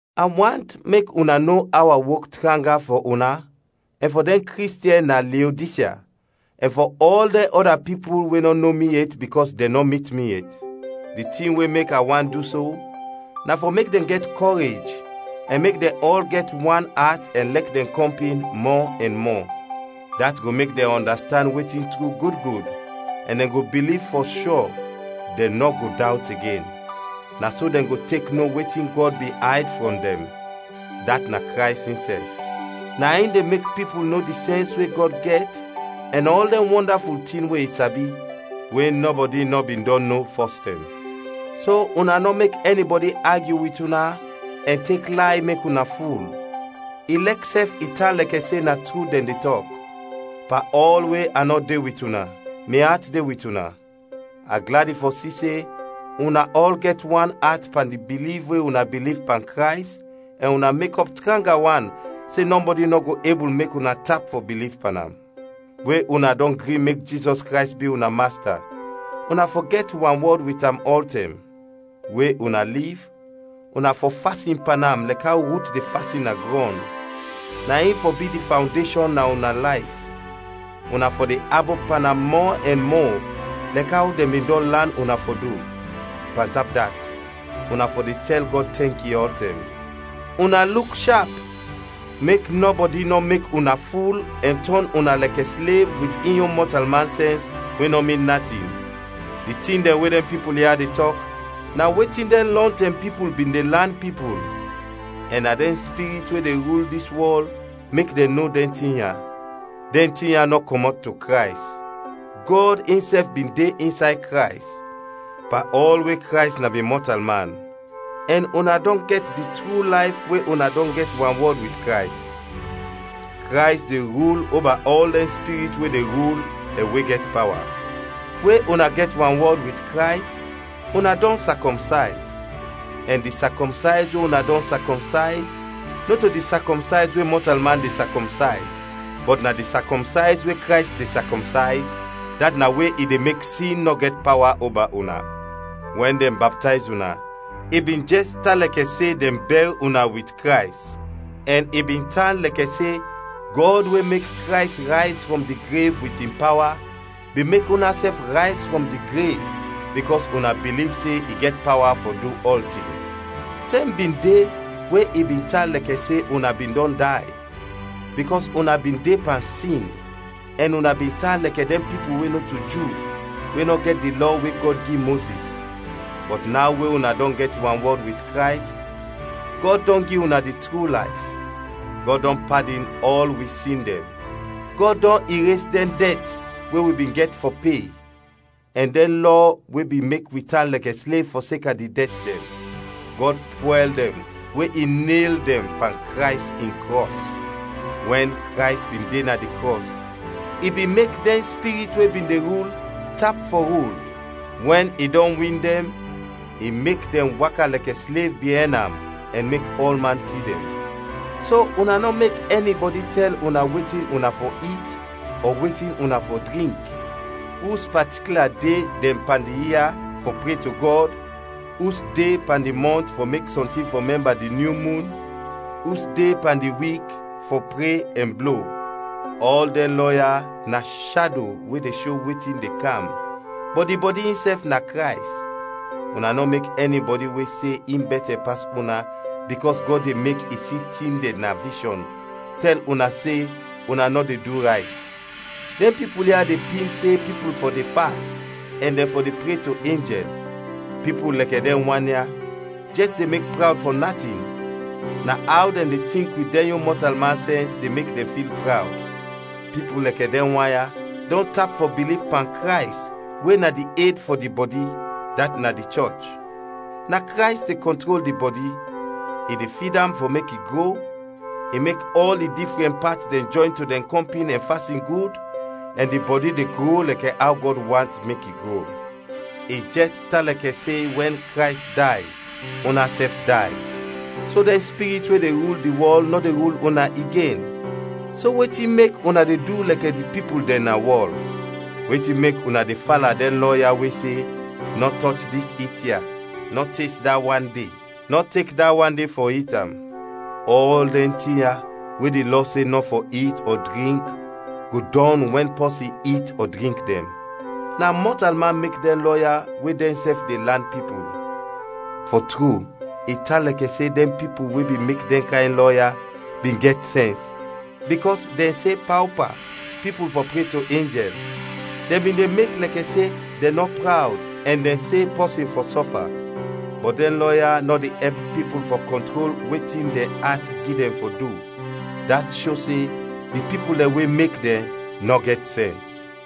A want mek una no aw a wok tranga fɔ una ɛn fɔ dɛn Kristiɛn na Leodisya ɛn fɔ ɔl dɛn ɔda pipul we nɔ no mi yet bikɔs dɛn nɔ mit mi yet. Di tin we mek a want du so na fɔ mek dɛn gɛt kɔrej ɛn mek dɛn ɔl gɛt wan at ɛn lɛk dɛn kɔmpin mɔ ɛn mɔ. Dat go mek dɛn ɔndastand wetin tru gud gud ɛn dɛn go biliv fɔ shɔ, dɛn nɔ go dawt igen. Na so dɛn go tek no wetin Gɔd bin ayd frɔm dɛn, dat na Krays insɛf. Na in de mek pipul no di sɛns we Gɔd gɛt ɛn ɔl dɛn wɔndaful tin we i sabi, we nɔbɔdi nɔ bin dɔn no fɔstɛm. So una nɔ mek ɛnibɔdi agyu wit una ɛn tek lay mek una ful, ilɛk sɛf i tan lɛkɛ se na tru dɛn de tɔk. Pan ɔl we a nɔ de wit una mi at de wit una. A gladi fɔ si se una ɔl gɛt wan at pan di biliv we una biliv pan Krays ɛn una mekɔp tranga wan se nɔbɔdi nɔ go ebul mek una tap fɔ biliv pan am. We una dɔn gri mek Jizɔs Krays bi una Masta, una fɔ gɛt wanwɔd wit am ɔltɛm. We una liv, una fɔ fasin pan am lɛkɛ aw rut de fasin na grɔn, na in fɔ bi di fawndeshɔn na una layf, una fɔ de abop pan am mɔ ɛn mɔ lɛk aw dɛn bin dɔn lan una fɔ du. Pantap dat, una fɔ de tɛl Gɔd tɛnki ɔltɛm. Una luk shap, mek nɔbɔdi nɔ mek una ful ɛn tɔn una lɛkɛ slev wit in yon mɔtalman sɛns we nɔ min natin; di tin dɛn we dɛn pipul ya de tɔk na wetin dɛn lɔntɛm pipul bin de lan pipul, ɛn na dɛn spirit we de rul dis wɔl mek dɛn no dɛn tin ya. Dɛn tin ya nɔ kɔmɔt to Krays. Gɔd insɛf bin de insay Krays, pan ɔl we Krays na bin mɔtalman, ɛn una dɔn gɛt di tru layf we una dɔn gɛt wanwɔd wit Krays. Krays de rul oba ɔl dɛn spirit we de rul ɛn we gɛt pawa. We una gɛt wanwɔd wit Krays, una dɔn sakɔmsayz, ɛn di sakɔmsayz we una dɔn sakɔmsayz nɔto di sakɔmsayz we mɔtalman de sakɔmsayz, bɔt na di sakɔmsayz we Krays de sakɔmsayz, dat na we i de mek sin nɔ gɛt pawa oba una. Wɛn dɛn baptayz una, i bin jɛs tan lɛkɛ se dɛn bɛr una wit Krays, ɛn i bin tan lɛkɛ se Gɔd we mek Krays rayz frɔm di grev wit in pawa bin mek unasɛf rayz frɔm di grev, bikɔs una biliv se i gɛt pawa fɔ du ɔltin. Tɛm bin de we i bin tan lɛkɛ se una bin dɔn day, bikɔs una bin de pan sin ɛn una bin tan lɛkɛ dɛn pipul we nɔto Ju we nɔ gɛt di Lɔ we Gɔd gi Mozis. Bɔt naw we una dɔn gɛt wanwɔd wit Krays, Gɔd dɔn gi una di tru layf. Gɔd dɔn padin ɔl wi sin dɛn. Gɔd dɔn ires dɛn dɛt we wi bin gɛt fɔ pe, ɛn dɛn lɔ we bin mek wi tan lɛkɛ slev fɔseka di dɛt dɛn. Gɔd pwɛl dɛn we i nel dɛn pan Krays in krɔs. Wɛn Krays bin de na di krɔs, i bin mek dɛn spirit we bin de rul, tap fɔ rul; we i dɔn win dɛn, i mek dɛn waka lɛkɛ slev biɛn am ɛn mek ɔlman si dɛn. So una nɔ mek ɛnibɔdi tɛl una wetin una fɔ it ɔ wetin una fɔ drink; us patikla de dɛn pan di ia fɔ pre to Gɔd; us de pan di mɔnt fɔ mek sɔntin fɔ mɛmba di nyu mun; us de pan di wik fɔ pre ɛn blo. Ɔl dɛn lɔ ya na shado we de sho wetin de kam, bɔt di bɔdi insɛf na Krays. Una nɔ mek ɛnibɔdi we se in bɛtɛ pas una bikɔs Gɔd de mek i si tin dɛn na vishɔn, tɛl una se una nɔ de du rayt. Dɛn pipul ya de pin se pipul fɔ de fast ɛn dɛn fɔ de pre to enjɛl. Pipul lɛkɛ dɛn wan ya jɛs de mek prawd fɔ natin, na aw dɛn de tink wit dɛn yon mɔtalman sɛns de mek dɛn fil prawd. Pipul lɛkɛ dɛn wan ya dɔn tap fɔ biliv pan Krays we na di ed fɔ di bɔdi, dat na di chɔch. Na Krays de kɔntrol di bɔdi. I de fid am fɔ mek i gro, i mek ɔl di difrɛn pat dɛn jɔyn to dɛn kɔmpin ɛn fasin gud, ɛn di bɔdi de gro lɛkɛ aw Gɔd want mek i gro. I jɛs tan lɛkɛ se wɛn Krays day, unasɛf day, so dɛn spirit we de rul di wɔl nɔ de rul una igen. So wetin mek una de du lɛkɛ di pipul dɛn na wɔl? Wetin mek una de fala dɛn lɔ ya we se, “Nɔ tɔch dis it ya,” “Nɔ tes da wan de,” “Nɔ tek da wan de fɔ it am?” Ɔl dɛn tin ya we di lɔ se nɔ fɔ it ɔ drink go dɔn wɛn pɔsin it dɛn ɔ drink dɛn. Na mɔtalman mek dɛn lɔ ya we dɛnsɛf de lan pipul. Fɔ tru, i tan lɛkɛ se dɛn pipul we bin mek dɛn kayn lɔ ya bin gɛt sɛns, bikɔs dɛn se paopa pipul fɔ pre to enjɛl, dɛn bin de mek lɛkɛ se dɛn nɔ prawd ɛn dɛn se pɔsin fɔ sɔfa. Bɔt dɛn lɔ ya nɔ de ɛp pipul fɔ kɔntrol wetin dɛn at gi dɛn fɔ du, dat sho se di pipul dɛn we mek dɛn, nɔ gɛt sɛns.